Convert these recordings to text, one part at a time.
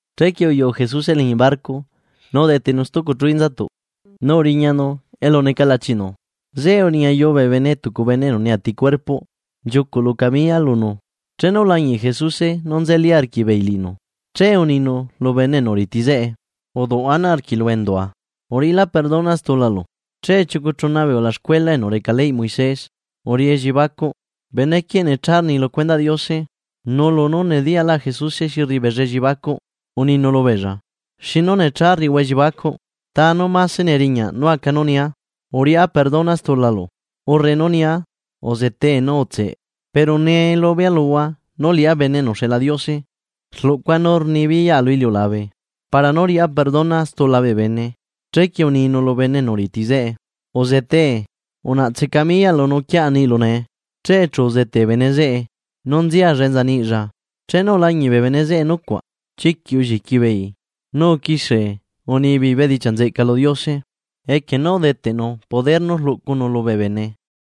Chequie uyuꞌu Jesuse liñi barco nu udetenu stucu chu inzatuꞌ nu uriñanu elu neca lachinu. Zeꞌe uriñayu bee bene tucu bene enu neati cuerpoꞌ nchiucuꞌ lu camiya lunu. Chenu ulañiꞌ Jesuse nú nzeli arquiꞌbeei liꞌinu, che uninu lu bene enu riti zeꞌe: ―Duꞌ ana arquiꞌlu endua. Uriꞌila perdona stulalu. Che chiucu chuna bee ulaxcuela enu reca leyꞌ Moisés uriꞌi elliebacuꞌ: “Benequieꞌ necha rni lu cuendaꞌ Diose.” Nu lunú nediyaꞌlaꞌ Jesuse xi rriꞌi beella elliebacuꞌ, uninu lubeella: ―¿Xinu necha rriꞌihua elliebacuꞌ? ¿Ta nú mase neriñaꞌ nú aca, nú nia: “Uriꞌá perdona stulalu”, urre nú nia: “Uzetee nu utseꞌ”? Pero nee lubea luhua nú liꞌá Bene enu uxeꞌla Diose rluꞌcua nú rnibiyaꞌa lu iliulabe para nú riꞌá perdona stula bee bene. Chequie uninu lu bene enu riti zeꞌe: ―Uzetee unaꞌtse camiyaꞌlu nu uquiaꞌa niꞌlu nee. Che chu uzete bene zeꞌe nu nzialla enza niꞌlla. Chenu ulañiꞌ bee bene zeꞌe nucuaꞌ chiquiꞌ ulliqui beei, nu uquixie unibeei bedichiaꞌ nzeꞌca lu Diose, equie nú udeteꞌnu poder nú rluꞌcunu lubee bene.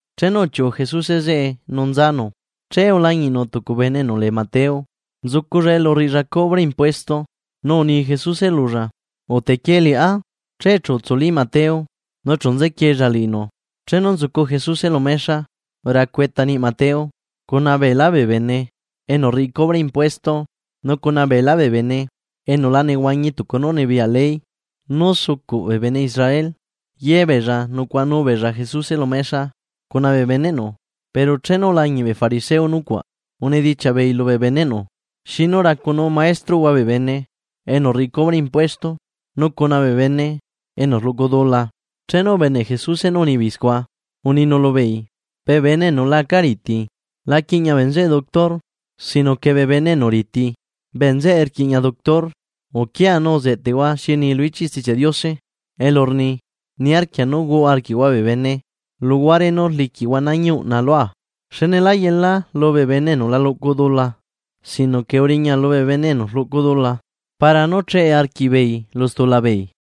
Chenu uchiuꞌu Jesuse zeꞌe nu nzanu, che ulañiꞌnu tucu bene enu lee Mateo, nzuculla elu rriꞌilla cubre impuesto, nu uni Jesuse lulla: ―Utequie liꞌá. Che chu utsuli Mateo nu chu nzequiella liꞌinu. Chenu nzucu Jesuse lu mexa racu eta niꞌ Mateo, cuna beelá bee bene enu rriꞌi cubre impuesto nu cuna beelá bee bene enu la nehuañi tucu nú rnibiyaꞌ ley nú sucuꞌ bee bene Israel, ye beella nucuaꞌanu beella Jesuse lu mexa cuna bee beneꞌnu. Pero chenu ulañiꞌ bee fariseo nucuaꞌ, unidichiaꞌ beei lubee beneꞌnu: ―¿Xinu racunuu maestroꞌhua bee bene enu rriꞌi cubre impuesto nu cuna bee bene enu rluꞌcu dula? Chenu ubeneꞌ Jesuse nú unibeei scua, uninu lubeei: ―Bee bene enu la aca riti, la quiꞌña bee nzeꞌe doctor. Sino que bee bene enu riti bee nzeꞌe rquiꞌña doctor. Uquiahua nu zeꞌtehua xi rni lu ichiꞌ Stichiaꞌ Diose elu rni: “Niarquia nú huaꞌa arquiꞌhua bee bene, luguare nú rliquiꞌhua nañi uꞌna lua.” Xne lá yelaa lubee bene enu la luꞌcu dula sino que uriña lubee bene enu rluꞌcu dula para nú cheꞌe arquiꞌbeei lu stula beei.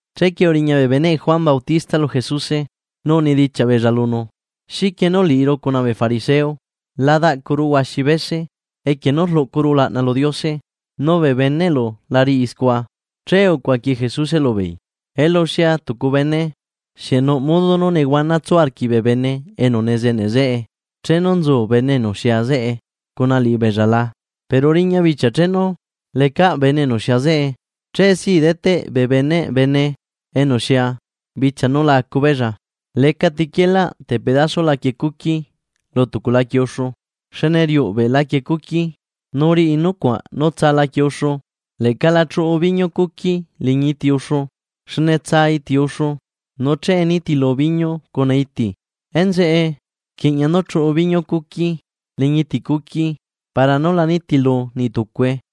Chequie uriña bee beneꞌ Juan Bautista lu Jesuse nu unidichiaꞌ beella lunu: ―¿Xiquie nú liꞌiru cuna bee fariseo, la daꞌcuru huaxi bese equie nú rluꞌcuru ulaꞌna lu Diose, nu bee beneꞌlu la riꞌi scua? Che ucuaqui Jesuse lubeei: ―Elu xia tucu bene, ¿xieꞌ nuꞌ modo nú nehuana tsu arquiꞌ bee bene enu nezeneꞌ zeꞌe chenu nzu bene enu xia zeꞌe cuna liꞌibeella la? Pero riña bichia chenu lecaꞌ bene enu xia zeꞌe. Chee si deteꞌ bee beneꞌ bene enu xia bichia nu la acu beella. ’Lecati quielaꞌ tepedaso laquie cuqui lu tucu laquie uxu, xne riuꞌbe laquie cuqui, nu riꞌi nucuaꞌ nú tsa laquie uxu. Leꞌca la chuꞌu biñu cuqui liñi iti uxu, xne tsaa iti uxu, nu che nitilu biñu cuna iti. Enzeꞌe rquiꞌña nú chuꞌu biñu cuqui liñi iti cuqui para nú la nitilu niꞌtucue.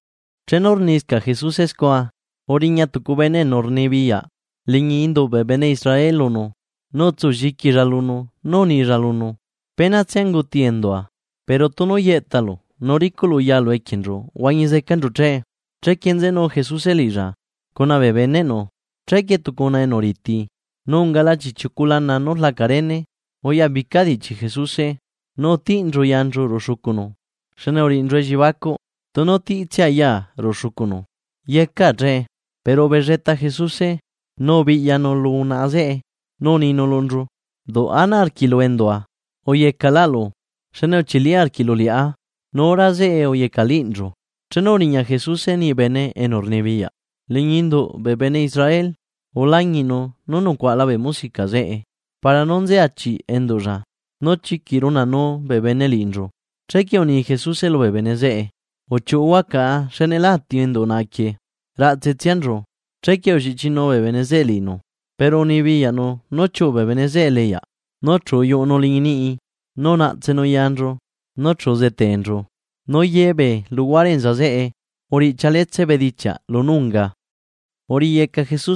Chenu rniscaꞌ Jesuse scua, uriña tucu bene enu rnibiyaꞌ liñi induꞌ bee bene Israel lunu, nu utsulliquilla lunu nu unilla lunu: ―Penatsia unguti endua, pero tunu yeꞌtalu nu ricuꞌlu yalu equienchu huañi zecanchu che. Chequie nzenu Jesuse liꞌilla, cuna bee beneꞌnu. Chequie tucu unaꞌa enu riti, nu ungala chiꞌchiucu lana nú rlaca rene, uyabica diꞌchi Jesuse nu utiꞌnchu yanchu ruꞌu xucunu, xne uriꞌinchu elliebacuꞌ: “Tunu tiꞌtsia yaa ruꞌu xucunu, yecaa che.” Pero ubelleta Jesuse, nu ubiꞌyanu lu unaꞌa zeꞌe nu uninu lunchu: ―Duꞌ ana arquiꞌlu endua uyecaꞌlaꞌlu xne uchili arquiꞌlu liꞌá. Nu hora zeꞌe uyecaꞌliꞌnchu. Chenu uriña Jesuse niꞌ bene enu rnibiyaꞌ liñi induꞌ bee bene Israel ulañiꞌnu nú nucuaꞌala bee musica zeꞌe para nú nzeachiꞌ enduꞌlla, nu chiquiꞌ runaꞌnuu bee bene liꞌinchu, chequie uni Jesuse lubee bene zeꞌe: ―Uchiuꞌuhua caꞌa xne lá ati enduꞌ unaꞌa quieꞌ, raꞌtse tsianchu. Chequie ulliꞌchinuu bee bene zeꞌe liꞌinu, pero unibiyaꞌnu nú chiuꞌu bee bene zeꞌe eleꞌyaꞌ, nu chu uyuꞌunu liñi niꞌi nu unaꞌtsenu yanchu, nuchu uzeteenchu. Nu ye bee luhuare enza zeꞌe uriꞌchialetse bedichiaꞌ lunú uriꞌinu.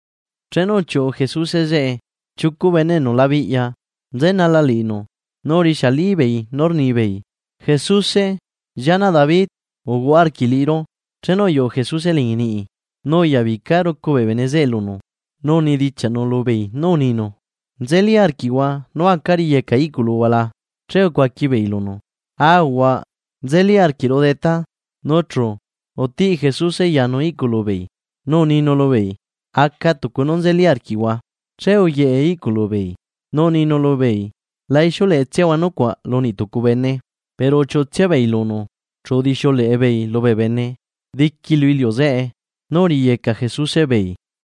Chenu uchiuꞌu Jesuse zeꞌe, chiucu bene enu labiꞌya nzenala liꞌinu, nu urixialibeei nú rnibeei: ―¡Jesuse, llianaꞌ David uhuaꞌa arquiꞌ liꞌiru! Chenu uyuꞌu Jesuse liñi niꞌi, nu uyabica rucu bee bene zeꞌe lunu, nu unidichiaꞌnu lubeei nú uninu: ―¿Nzelí arquiꞌhua nú acaa riyecaa iꞌculuhua la? Che ucuaqui beei lunu: ―Aahuaꞌ, nzeli arquiꞌru detá. Nu chu, utiꞌ Jesuse yanu iꞌculu beei nu uninu lubeei: ―Aca Tucu nú nzeli arquiꞌhua. Che uyeꞌe iꞌculu beei. Nu uninu lubeei: ―La ixiuleꞌetsiahua nucuaꞌ lu niꞌ tucu bene. Pero uchiuꞌutsia beei lunu, chu udixiuleꞌe beei lubee bene diqui lu iliu zeꞌe nú uriyeca Jesuse beei.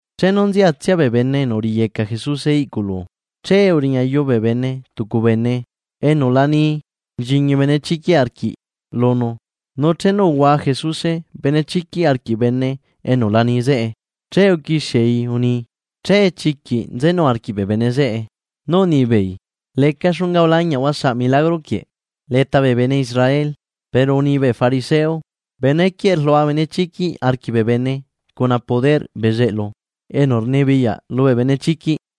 Chenu nziatsia bee bene enu uriyeca Jesuse iꞌculu, che uriñayu bee bene tucu bene enu la ni nchiñi benechiquiꞌ arquiꞌ lunu. Nu chenu uhua Jesuse benechiquiꞌ arquiꞌ bene enu la ni zeꞌe, che uquixiei uni. Che chiquiꞌ nzenu arquiꞌ bee bene zeꞌe nú unibeei: ―¡Leca xunga ulañiꞌahua saꞌ milagro quieꞌ leta bee bene Israel! Pero uni bee fariseo: ―Benequieꞌ rlua benechiquiꞌ arquiꞌ bee bene cuna poder bezeꞌlu enu rnibiyaꞌ lubee benechiquiꞌ.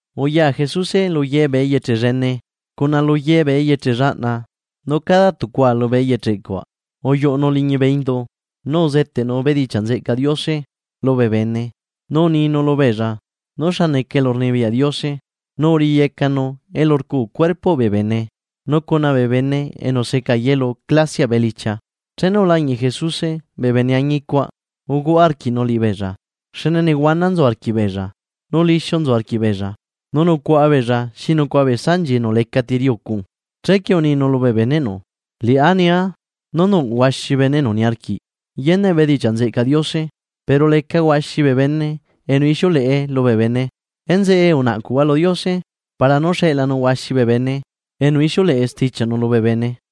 Uya Jesuse lu ye bee eyeche llene cuna lu ye bee eyeche llaꞌna, nu cada tucua lubee eyeche cuaꞌ uyuꞌunu liñi bee indu uzeteꞌnu bedichiaꞌ nzeꞌcaꞌ Diose lubee bene, nu uninu lubeella nú xa neca elurnibiyaꞌ Diose, nu uriyecanu elu rcu cuerpoꞌ bee bene, nu cuna bee bene enu seca yelu clasiaꞌ elichia. Chenu ulañiꞌ Jesuse bee bene añi cuaꞌ uhuaꞌa arquiꞌnu liꞌibeella, xne nehuana nzu arquiꞌbeella, nu lixiu nzu arquiꞌbeella, nu nucuaꞌa beella xi nucuaꞌa bee sanchi enu lecaꞌ ti riꞌi ucu. Chequie uninu lubee beneꞌnu: ―Liꞌá nia nú nuꞌ huaxi bee bene enu niarquiꞌ yeneꞌ bedichiaꞌ nzeꞌcaꞌ Diose, pero leca huaxi bee bene enu ixiuleꞌe lubee bene. Enzeꞌe unaꞌcuhua lu Diose para nú xeꞌlanu huaxi bee bene enu ixiuleꞌe stichiaꞌnu lubee bene.